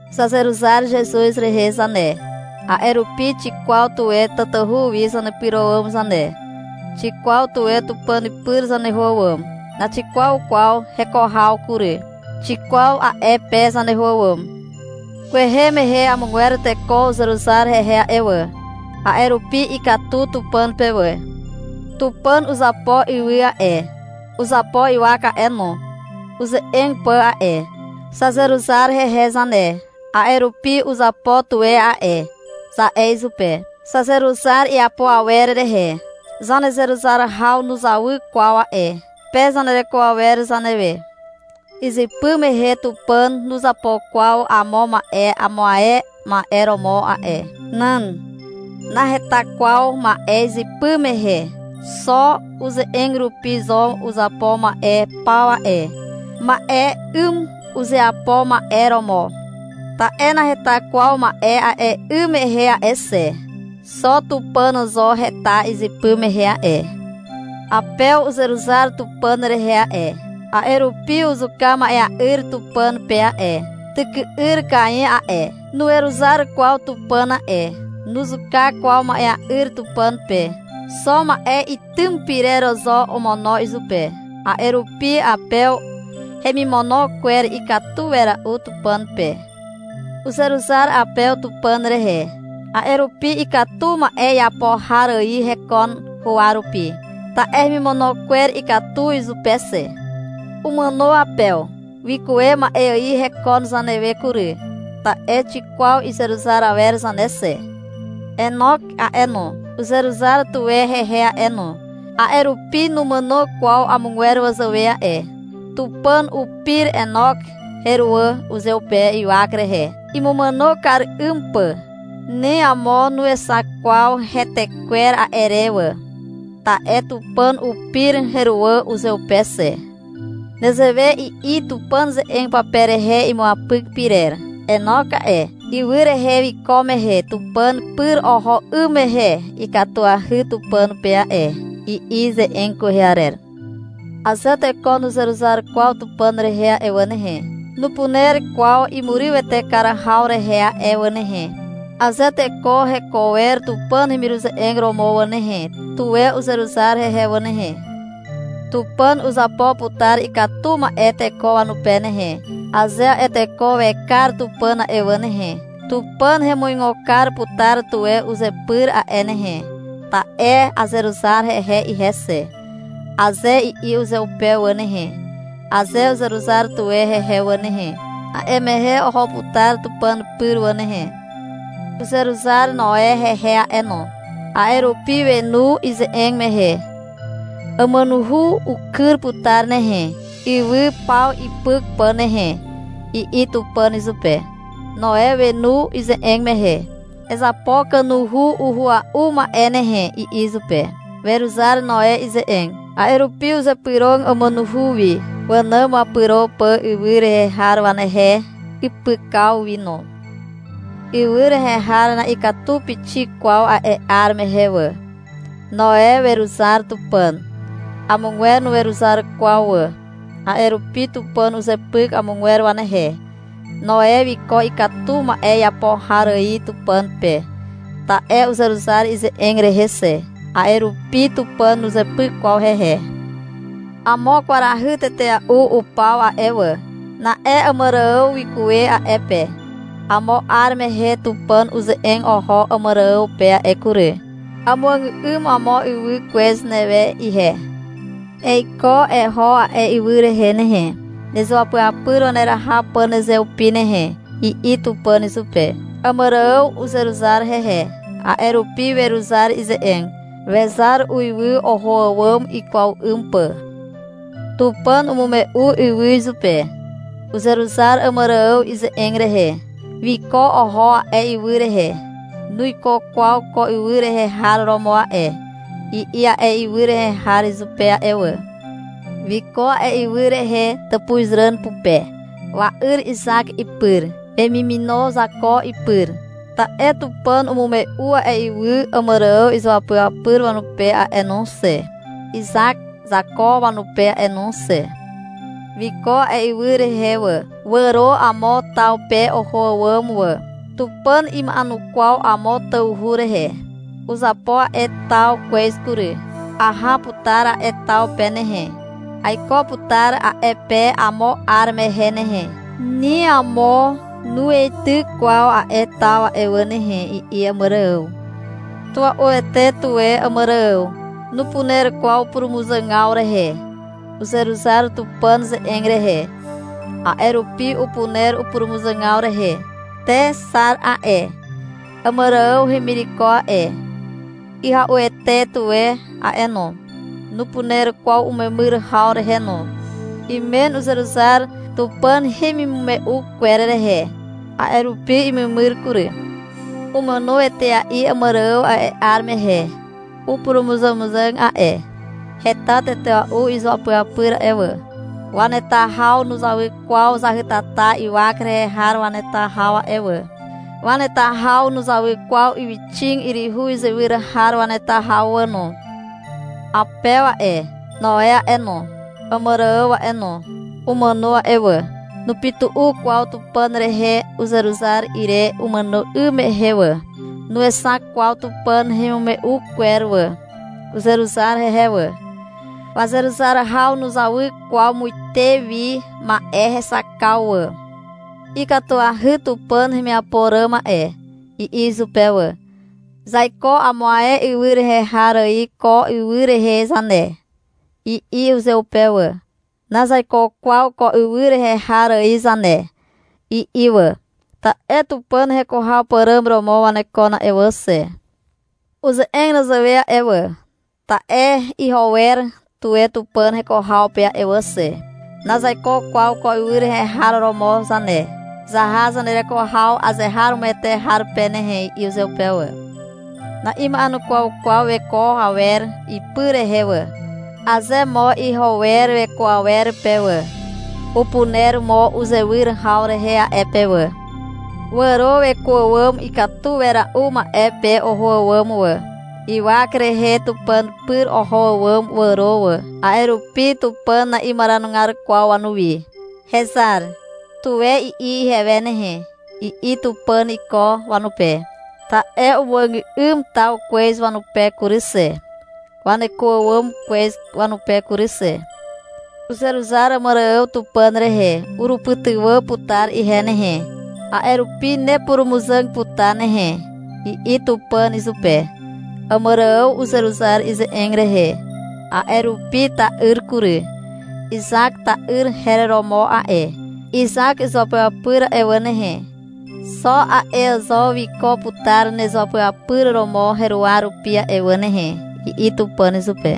Zazeruzar Zezuz rehe zane. A'e rupi xikwaw tuwe tatahu wi zanepyro àwàm zane. Xikwaw tuwe Tupàn pyr zaneho àwàm. Naxixak kwaw heko haw kury. Xikwaw a'e pe zaneho àwàm. Kwehe mehe amogwer teko uzeruzar hehe a'e wà. A'e rupi ikatu Tupàn pe wà. Tupàn uzapo ywy a'e, uzapo ywak a'e no, uze'eg pà a'e. Zazeruzar hehe zane, a'e rupi — Uzapo tuwe a'e, za'e izupe. Zazeruzar iapo awer rehe. Zanezeruzar haw nuzawy kwaw a'e pe zanereko awer zanewe. Izypy mehe Tupàn nuzapo kwaw amo ma'e amo ae ma'e romo a'e. Nan. Naheta kwaw ma'e izypy mehe. Xo uze'eg rupi zo uzapo ma'e paw a'e. Ma'e 'ym uzeapo ma'e romo. Ta'e naheta kwaw ma'e a'e 'ym mehe a'e xe. Xo Tupàn zo heta izypy mehe a'e. Apew uzeruzar Tupàn rehe a'e, a'e rupi uzuka ma'ea'yr Tupàn pe a'e. Tyky'yr Kain a'e, nuweruzar kwaw Tupàn a'e. Nuzuka kwaw ma'ea'yr Tupàn pe. Xo ma'e itym pyrer zo omono izupe. A'e rupi Apew hemimono kwer ikatu wera'u Tupàn pe. Uzeruzar Apew Tupàn rehe, a'e rupi ikatu ma'e iapo har ài hekon huwa rupi, ta'e hemimono kwer ikatu izupe xe. Umàno Apew. Wikuwe ma'e ài hekon zanewe kury, ta'e xikwaw izeruzar awer zane xe. Enok a'e no, uzeruzar tuwe hehe a'e no, a'e rupi numàno kwaw amogwer wazàwe a'e. Tupàn upir Enok heruwà uzeupe ywak rehe, imumàno kar 'ym pà. Ni amo nuexak kwaw hetekwer a'e re wà. Ta'e Tupàn upir heruwà uzeupe xe. Nezewe i'i Tupàn ze'eg pape rehe imuapyk pyrer. — Enok a'e, ywy rehe wiko mehe Tupàn pyr oho 'ym mehe ikatuahy Tupàn pe a'e, i'i ze'eg kwehe arer. Aze teko nuzeruzar kwaw Tupàn rehe a'e wà nehe, nupuner kwaw imurywete kar haw rehe a'e wà nehe. Aze teko heko wer Tupàn hemiruze'eg romo wà nehe, tuwe uzeruzar hehe wà nehe. Tupàn uzapo putar ikatu ma'e teko wanupe nehe, aze a'e teko wekar Tupàn a'e wà nehe. — Tupàn hemuigo kar putar tuwe uzepyr a'e nehe, ta'e azeruzar hehe ihe xe, aze i'i uzeupe wà nehe, aze uzeruzar tuwe hehe wà nehe, a'e mehe oho putar Tupàn pyr wà nehe. Uzeruzar Noe hehe a'e no. A'e rupi wenu ize'eg mehe. — Àmànuhu ukyr putar nehe, ywy paw ipyk pà nehe, i'i Tupàn izupe. Noe wenu ize'eg mehe. — Ezapo kanuhu uhua'u ma'e nehe, i'i izupe. Weruzar Noe ize'eg. A'e rupi uzepyro àmànuhu wi, wànàm wapyro pà ywy rehe har wanehe ipykaw wi no. Ywy rehe har na'ikatu pixik kwaw a'e 'ar mehe wà. Noe weruzar Tupàn. Amogwer nuweruzar kwaw wà. A'e rupi Tupàn uzepyk amogwer wanehe. Noe wiko ikatu ma'e iapo har ài Tupàn pe, ta'e uzeruzar ize'eg rehe xe. A'e rupi Tupàn nuzepyk kwaw hehe. Amo kwarahy tetea'u upaw a'e wà. Na'e Àmàrààw wikuwe a'e pe. Amo 'ar mehe Tupàn uze'eg oho Àmàrààw pe a'e kury. — Amuàgà'ym amo ywy kwez newe ihe. Eiko eho a'e ywy rehe nehe, nezuapyapyr waneraha pà nezeupi nehe, i'i Tupàn izupe. Àmàrààw uzeruzar hehe. A'e rupi weruzar ize'eg. Wezar uiwy, oho àwàm ikwaw 'ym pà. Tupàn umume'u ywy izupe. Uzeruzar Àmàrààw ize'eg rehe. Wiko oho a'e ywy rehe. — Nuiko kwaw ko ywy rehe har romo a'e, i'i a'e ywy rehe har izupe a'e wà. Wiko a'e ywy rehe tàpuzràn pupe, wa'yr Izak ipyr, wemimino Zako ipyr. Ta'e Tupàn umume'u a'e ywy Àmàrààw izuapyapyr wanupe a'e no xe, Izak Zako wanupe a'e no xe. Wiko a'e ywy rehe wà. Wàro amo taw pe oho àwàm wà. — Tupàn ima'enukwaw amo tawhu rehe. Uzapo a'e taw kwez kury. Aha putar a'e taw pe nehe, aiko putar a'e pe amo 'ar mehe nehe. Ni amo nuweityk kwaw a'e taw a'e wà nehe, i'i Àmàrààw. Tua'uete tuwe Àmàrààw. Nupuner kwaw upurumuzàgaw rehe. Uzeruzar Tupàn ze'eg rehe. A'e rupi upuner upurumuzàgaw rehe. Te Xar a'e, Àmàrààw hemireko a'e, ihya'uete tuwe a'e no. Nupuner kwaw umemyr haw rehe no. Imen uzeruzar Tupàn hemimume'u kwer rehe. A'e rupi imemyr kury. Umàno etea'i Àmàrààw a'e 'ar mehe. Upurumuzàmuzàg a'e. Heta tetea'u izuapyapyr a'e wà. Waneta haw nuzawy kwaw zahytata ywak rehe har waneta haw a'e wà. Waneta haw nuzawy kwaw ywyxig yryhu izywyr har waneta haw wà no. Apew a'e, Noe a'e no, Àmàrààw a'e no, umàno a'e wà. Nupytu'u kwaw Tupàn rehe uzeruzar ire umàno 'ym mehe wà. Nuexak kwaw Tupàn hemimume'u kwer wà. Uzeruzar hehe wà. Wazeruzar haw nuzawy kwaw muite wi ma'e hexakaw wà. — Ikatuahy Tupàn hemiapo ràm a'e, i'i izupe wà. — Zaiko amo ae ywy rehe har ài ko ywy rehe zane, i'i uzeupe wà. — Nazaiko kwaw ko ywy rehe har ài zane, i'i wà, ta'e Tupàn heko haw pàràm romo wanekon a'e wà xe. Uze'eg nezewe a'e wà, ta'e iho wer tuwe Tupàn heko haw pe a'e wà xe. — Nazaiko kwaw ko ywy rehe har romo zane. Zaha zanereko haw azeharomoete har pe nehe, i'i uzeupe wà. Na'ima'enukwaw kwaw weko awer ipy rehe wà. Aze mo iho wer weko awer pe wà, upuner mo uzewyr haw rehe a'e pe wà. Wàro weko àwàm ikatu wera'u ma'e pe oho àwàm wà. Ywak rehe Tupàn pyr oho àwàm wàro wà. A'e rupi Tupàn na'imaranugar kwaw wanuwi. — Hezar, tuwe i'i ihewe nehe, i'i Tupàn iko wanupe. Ta'e umuàgà'ym taw kwez wanupe kury xe, waneko àwàm kwez wanupe kury xe. Uzeruzar Àmàrààw Tupàn rehe. — Urupytywà putar ihe nehe, a'e rupi nepurumuzàg putar nehe, i'i Tupàn izupe. Àmàrààw uzeruzar ize'eg rehe. A'e rupi ta'yr kury. Izak ta'yr her romo a'e. — Izak izuapyapyr a'e wà nehe, xo a'e zo wiko putar nezuapyapyr romo heruwa rupi a'e wà nehe, i'i Tupàn izupe.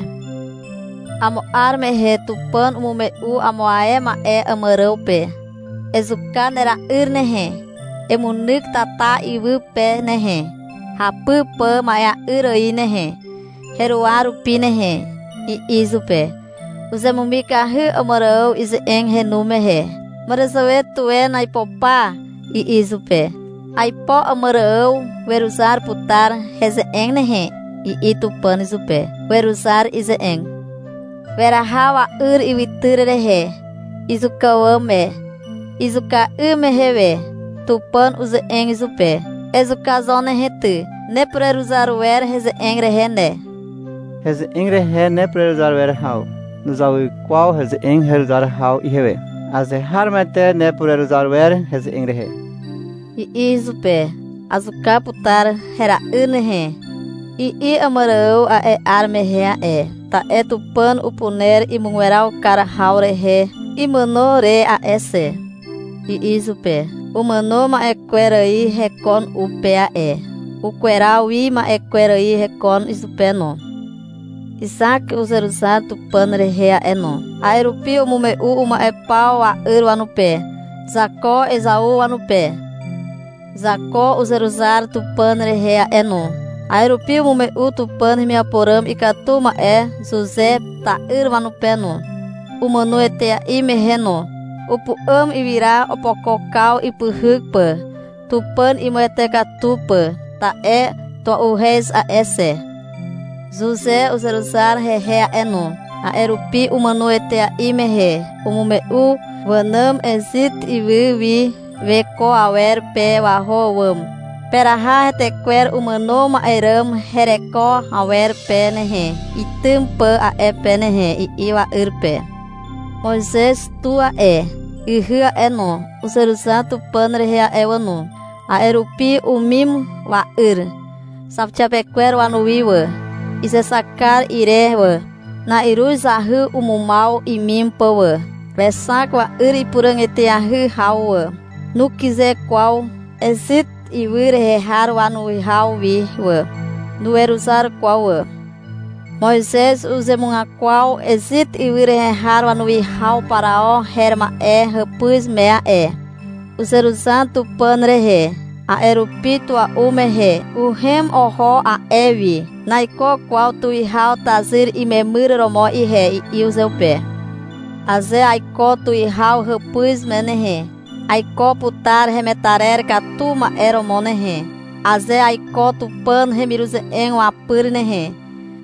Amo 'ar mehe Tupàn umume'u amo ae ma'e Àmàrààw pe. — Ezuka nera'yr nehe, emunyk tata iwy pe nehe, hapy pà ma'ea'yr ài nehe, heruwa rupi nehe, i'i izupe. Uzemumikahy Àmàrààw ize'eg henu mehe. — Màràzàwe tuwen aipo pa, i'i izupe. — Aipo Àmàrààw weruzar putar heze'eg nehe, i'i Tupàn izupe. Weruzar ize'eg. Weraha wa'yr ywytyr rehe, izuka àwàm me. Izuka 'ym mehe we Tupàn uze'eg izupe. — Ezuka zo nehe ty, nepureruzar wer heze'eg rehe ne. Heze'eg rehe nepureruzar wer haw nuzawy kwaw heze'eg heruzar haw ihewe. Azeharomoete nepureruzar wer heze'eg rehe, i'i izupe. — Azuka putar hera'yr nehe, i'i Àmàrààw a'e 'ar mehe a'e. — Ta'e Tupàn upuner imugweraw kar haw rehe imàno re a'e xe, i'i izupe. Umàno ma'e kwer ài hekon u pe a'e, ukweraw wi ma'e kwer ài hekon izupe no. Izak uzeruzar Tupàn rehe a'e no. A'e rupi umume'u uma'e paw wa'yr wanupe, Zako Ezau wanupe. Zako uzeruzar Tupàn rehe a'e no. A'e rupi umume'u Tupàn hemiapo ràm ikatu ma'e Zuze ta'yr wanupe no, umàno etea'i mehe no. Upu'àm ywyra opokokaw ipyhyk pà, Tupàn imuwete katu pà, ta'e tua'uhez a'e xe. Zuze uzeruzar hehe a'e no. A'e rupi umàno etea'i mehe umume'u wànàm Ezit ywy wi weko awer pe waho àwàm. — Peraha heretekwer umàno ma'e ràm hereko awer pe nehe, itym pà a'e pe nehe, i'i wa'yr pe. Moizez tu a'e, ihy a'e no, uzeruzar Tupàn rehe a'e wà no. A'e rupi umim wa'yr zauxiapekwer wanuwi wà, izexak kar ire wà. Na'iruz zahy umumaw imim pà wà. Wexak wa'yr ipuràg eteahy haw wà. Nukyze kwaw Ezit ywy rehe har wanuwihaw wi wà. Nuweruzar kwaw wà. Moizez uzemugakwaw Ezit ywy rehe har wanuwihaw Parao her ma'e hàpuz me a'e. Uzeruzar Tupàn rehe. A'e rupi tua'u mehe uhem oho a'e wi. — Naiko kwaw tuwihaw tazyr imemyr romo ihe, i'i uzeupe. — Aze aiko tuwihaw hàpuz me nehe, aiko putar hemetarer katu ma'e romo nehe. Aze aiko Tupàn hemiruze'eg wapyr nehe,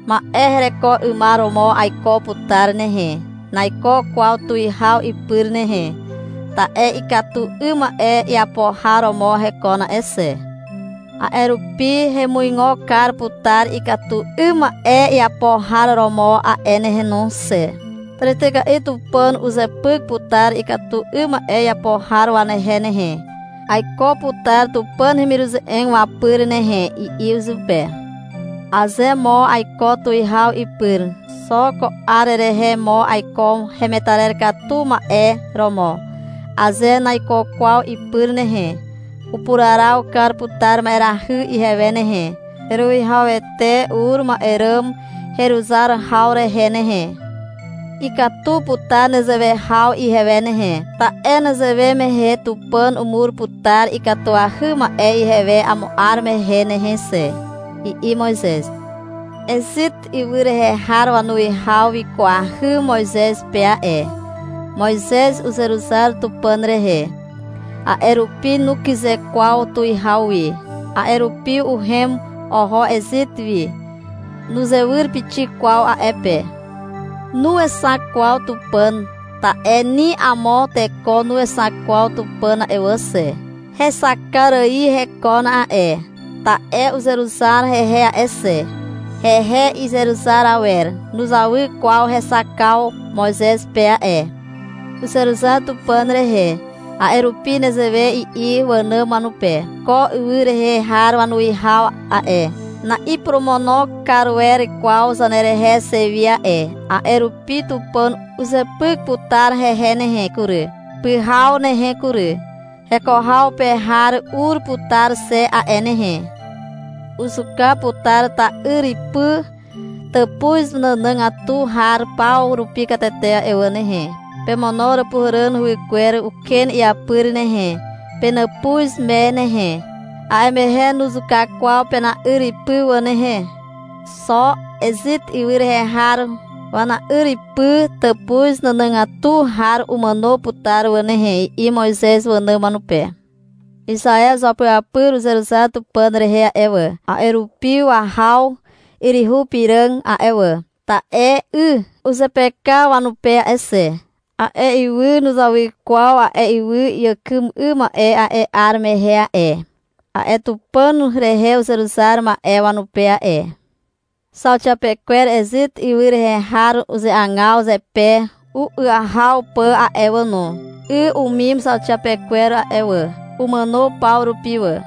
ma'e hereko 'ymar romo aiko putar nehe. Naiko kwaw tuwihaw ipyr nehe, ta'e ikatu 'ym ma'e iapo har romo hekon a'e xe. A'e rupi hemuigo kar putar ikatu 'ym ma'e iapo har romo a'e nehe no xe. Tàrityka'i Tupàn uzepyk putar ikatu 'ym ma'e iapo har wanehe nehe. Aiko putar Tupàn hemiruze'eg wapyr nehe, i'i izupe. — Aze mo aiko tuwihaw ipyr, xo ko 'ar rehe mo aiko hemetarer katu ma'e romo. Aze naiko kwaw ipyr nehe, upuraraw kar putar ma'erahy ihewe nehe, heruwihawete ur ma'e ràm heruzar haw rehe nehe. Ikatu putar nezewe haw ihewe nehe, ta'e nezewe mehe Tupàn umur putar ikatuahy ma'e ihewe amo 'ar mehe nehe xe, i'i Moizez. Ezit ywy rehe har wanuwihaw wikwahy Moizez pe a'e. Moizez uzeruzar Tupàn rehe. A'e rupi nukyze kwaw tuwihaw wi. A'e rupi uhem oho Ezit wi. Nuzewyr pixik kwaw a'e pe. Nuexak kwaw Tupàn, ta'e ni amo teko nuexak kwaw Tupàn a'e wà xe. Hexakar ài hekon a'e. Ta'e uzeruzar hehe a'e xe. Hehe izeruzar awer nuzawy kwaw hexakaw Moizez pe a'e. Uzeruzar Tupàn rehe. A'e rupi nezewe i'i wànàm wanupe. — Ko ywy rehe har wanuwihaw a'e, na'iporomono kar wer kwaw zanerehe xe wi a'e. A'e rupi Tupàn uzepyk putar hehe nehe kury, pyhaw nehe kury. Heko haw pe har ur putar xe a'e nehe. Uzuka putar ta'yripy tàpuz nànàgatu har paw rupi katete a'e wà nehe. Pemono Àràpuhàràn huwykwer uken iapyr nehe, penàpuz me nehe. A'e mehe nuzuka kwaw pena'yripy wà nehe. Xo Ezit ywy rehe har wana'yripy tàpuz nànàgatu har umàno putar wà nehe, i'i Moizez wànàm wanupe. Izaew izuapyapyr uzeruzar Tupàn rehe a'e wà, a'e rupi wahaw yryhu piràg a'e wà, ta'e 'y uzepeka wanupe a'e xe. A'e ywy nuzawy kwaw ywy iàkym 'ym ma'e ài a'e 'ar mehe a'e, a'e Tupàn rehe uzeruzar ma'e wanupe a'e. Zauxiapekwer Ezit ywy rehe har uzeagaw zepe u'yahaw pà a'e wà no. 'Y umim zauxiapekwer a'e wà. Umàno paw rupi wà.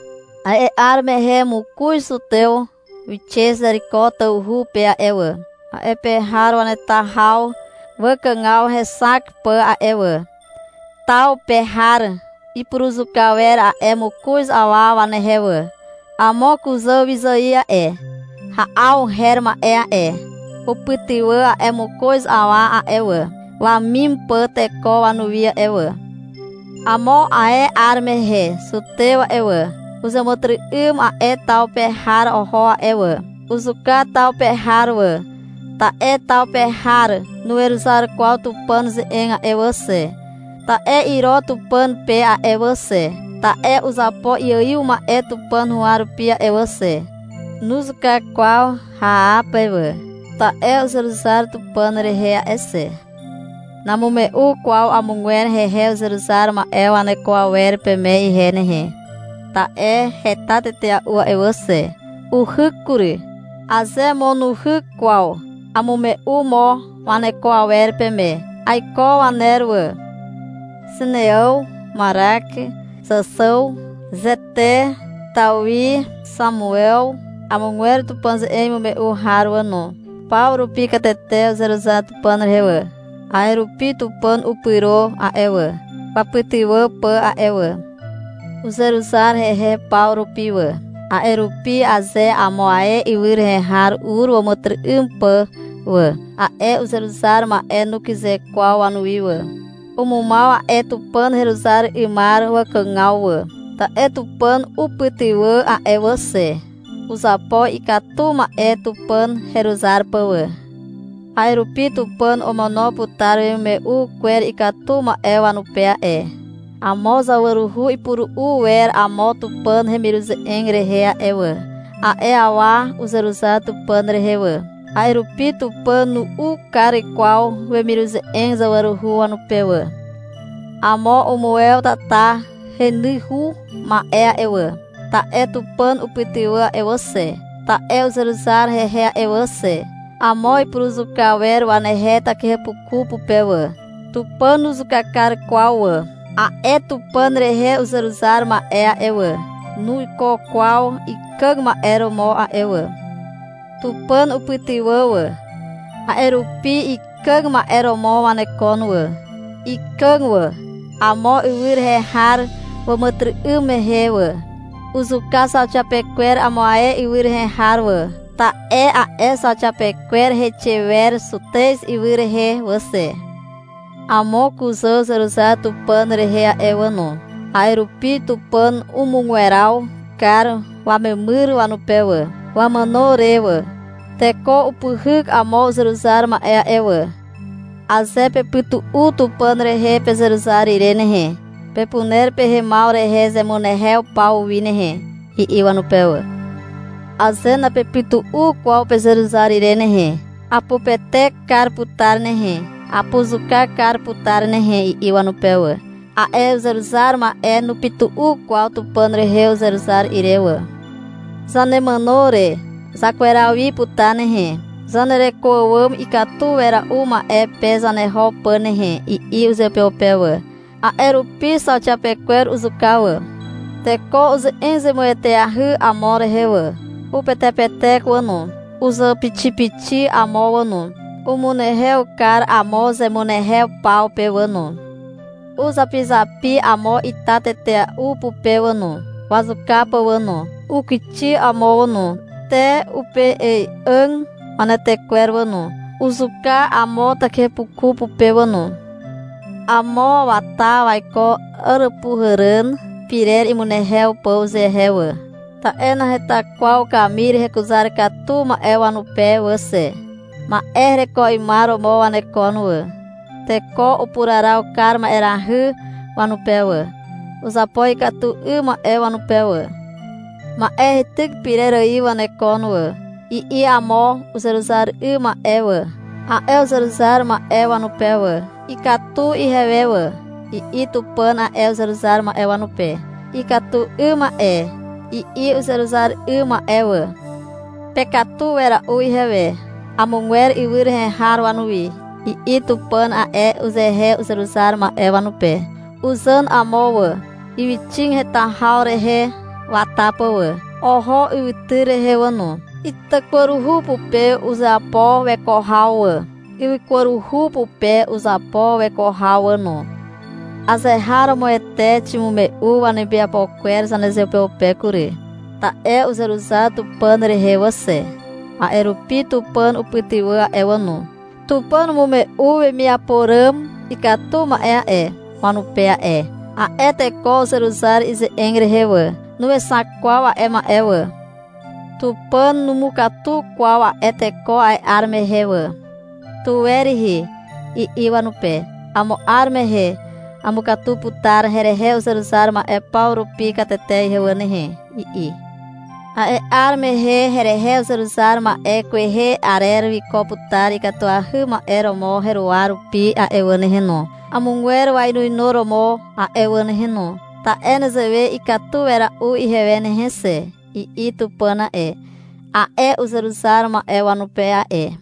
A'e 'ar mehe mokoz zutew wixe Zeriko tawhu pe a'e wà, a'e pe har waneta haw wakàgaw hexak pà a'e wà. Taw pe har ipuruzuka wer a'e mokoz awa wanehe wà. Amo kuzàwyzài a'e, Ha'aw her ma'e a'e, upytywà a'e mokoz awa a'e wà, wamim pà teko wanuwi a'e wà. Amo ae 'ar mehe zutew a'e wà, uzàmàtyry'ym a'e taw pe har oho a'e wà. Uzuka taw pe har wà, ta'e taw pe har nuweruzar kwaw Tupàn ze'eg a'e wà xe, (ta'e iro Tupàn pe a'e wà xe, ta'e uzapo iaiw ma'e Tupàn huwa rupi a'e wà xe). Nuzuka kwaw Haape wà, ta'e uzeruzar Tupàn rehe a'e xe. Namume'u kwaw amogwer hehe uzeruzar ma'e waneko awer peme ihe nehe, ta'e heta tetea'u a'e wà xe. Uhyk kury. Aze mo nuhyk kwaw, amume'u mo waneko awer peme. Aiko waner wà. Zineàw, Marak, Zàxàw, Zete, Tawi, Xamuew, amogwer Tupàn ze'eg imume'u har wà no. Paw rupi katete uzeruzar Tupàn rehe wà. A'e rupi Tupàn upyro a'e wà, wapytywà pà a'e wà. Uzeruzar hehe paw rupi wà. A'e rupi aze amo ae ywy rehe har ur wàmàtyry'ym pà wà, a'e uzeruzar ma'e nukyze kwaw wanuwi wà. Umumaw a'e Tupàn heruzar 'ymar wakàgaw wà. Ta'e Tupàn upytywà a'e wà xe. Uzapo ikatu ma'e Tupàn heruzar pà wà. A'e rupi Tupàn omono putar wemimume'u kwer ikatu ma'e wanupe a'e. Amo zawaruhu ipuru'u wer amo Tupàn hemiruze'eg rehe a'e wà. A'e awa uzeruzar Tupàn rehe wà. A'e rupi Tupàn nu'u kar kwaw wemiruze'eg zawaruhu wanupe wà. Amo umuwew tata henyhu ma'e a'e wà, ta'e Tupàn upytywà a'e wà xe, ta'e uzeruzar hehe a'e wà xe. Amo ipuruzuka wer wanehe takihepuku pupe wà. Tupàn nuzuka kar kwaw wà. A'e Tupàn rehe uzeruzar ma'e a'e wà, nuiko kwaw ikàg ma'e romo a'e wà. Tupàn upytywà wà. A'e rupi ikàg ma'e romo wanekon wà. Ikàg wà, amo ywy rehe har wàmàtyry'ym mehe wà. Uzuka zauxiapekwer amo ae ywy rehe har wà, ta'e a'e zauxiapekwer heixe wer Zutez ywy rehe wà xe. Amo kuzà uzeruzar Tupàn rehe a'e wà no. A'e rupi Tupàn umugweraw kar wamemyr wanupe wà, wamàno re wà. Teko upyhyk amo uzeruzar ma'e a'e wà. — Aze pepytu'u Tupàn rehe pezeruzar ire nehe, pepuner pehemaw rehe zemunehew paw wi nehe, i'i wanupe wà. Aze napepytu'u kwaw pezeruzar ire nehe, apupetek kar putar nehe, apuzuka kar putar nehe, i'i wanupe wà. A'e uzeruzar ma'e nupytu'u kwaw Tupàn rehe uzeruzar ire wà. — Zanemàno re zakweraw wi putar nehe, zanereko àwàm ikatu wera'u ma'e pe zaneho pà nehe, i'i uzeupeupe wà. A'e rupi zauxiapekwer uzuka wà. Teko uze'eg zemueteahy amo rehe wà, upetepetek wà no. Uzàpixipixi amo wà no. Umunehew kar amo zemunehew paw pe wà no. Uzapizapi amo ita tetea'u pupe wà no, wazuka pà wà no. Ukixi amo wà no, te upei'ài'àg wanetekwer wà no. Uzuka amo takihepuku pupe wà no. Amo wata waiko Àràpuhàràn pirer imunehew pà uzehe wà, ta'e naheta kwaw kamir hekuzar katu ma'e wanupe wà xe. Ma'e hereko 'ymar romo wanekon wà. Teko upuraraw kar ma'erahy wanupe wà. Uzapo ikatu 'ym ma'e wanupe wà. — Ma'e heityk pyrer ài wanekon wà, i'i amo uzeruzar 'ym ma'e wà, a'e uzeruzar ma'e wanupe wà. — Ikatu ihewe wà, i'i Tupàn a'e uzeruzar ma'e wanupe. — Ikatu 'ym ma'e, i'i uzeruzar 'ym ma'e wà. — Pekatu wera'u ihewe, amogwer ywy rehe har wanuwi, i'i Tupàn a'e uzehe uzeruzar ma'e wanupe. Uzàn amo wà, ywyxig heta haw rehe wata pà wà. Oho ywytyr rehe wà no. Itakwaruhu pupe uzapo weko haw wà. Ywykwaruhu pupe uzapo weko haw wà no. Azeharomoete ximume'u wanemiapo kwer zanezeupeupe kury. Ta'e uzeruzar Tupàn rehe wà xe. A'e rupi Tupàn upytywà a'e wà no. Tupàn umume'u wemiapo ràm ikatu ma'e a'e, wanupe a'e. A'e teko uzeruzar ize'eg rehe wà. Nuexak kwaw a'e ma'e wà. Tupàn numukatu kwaw a'e teko a'e 'ar mehe wà. — Tuwe rihi, i'i wanupe. — Amo 'ar mehe amukatu putar herehe uzeruzar ma'e paw rupi katete ihe wà nehe, i'i. — A'e 'ar mehe a'e herehe uzeruzar ma'e kwehe arer wiko putar ikatuahy ma'e romo heruwa rupi a'e wà nehe no, amogwer wainuinuromo a'e wà nehe no. Ta'e nezewe ikatu wera'u ihewe nehe xe, i'i Tupàn a'e, a'e uzeruzar ma'e wanupe a'e.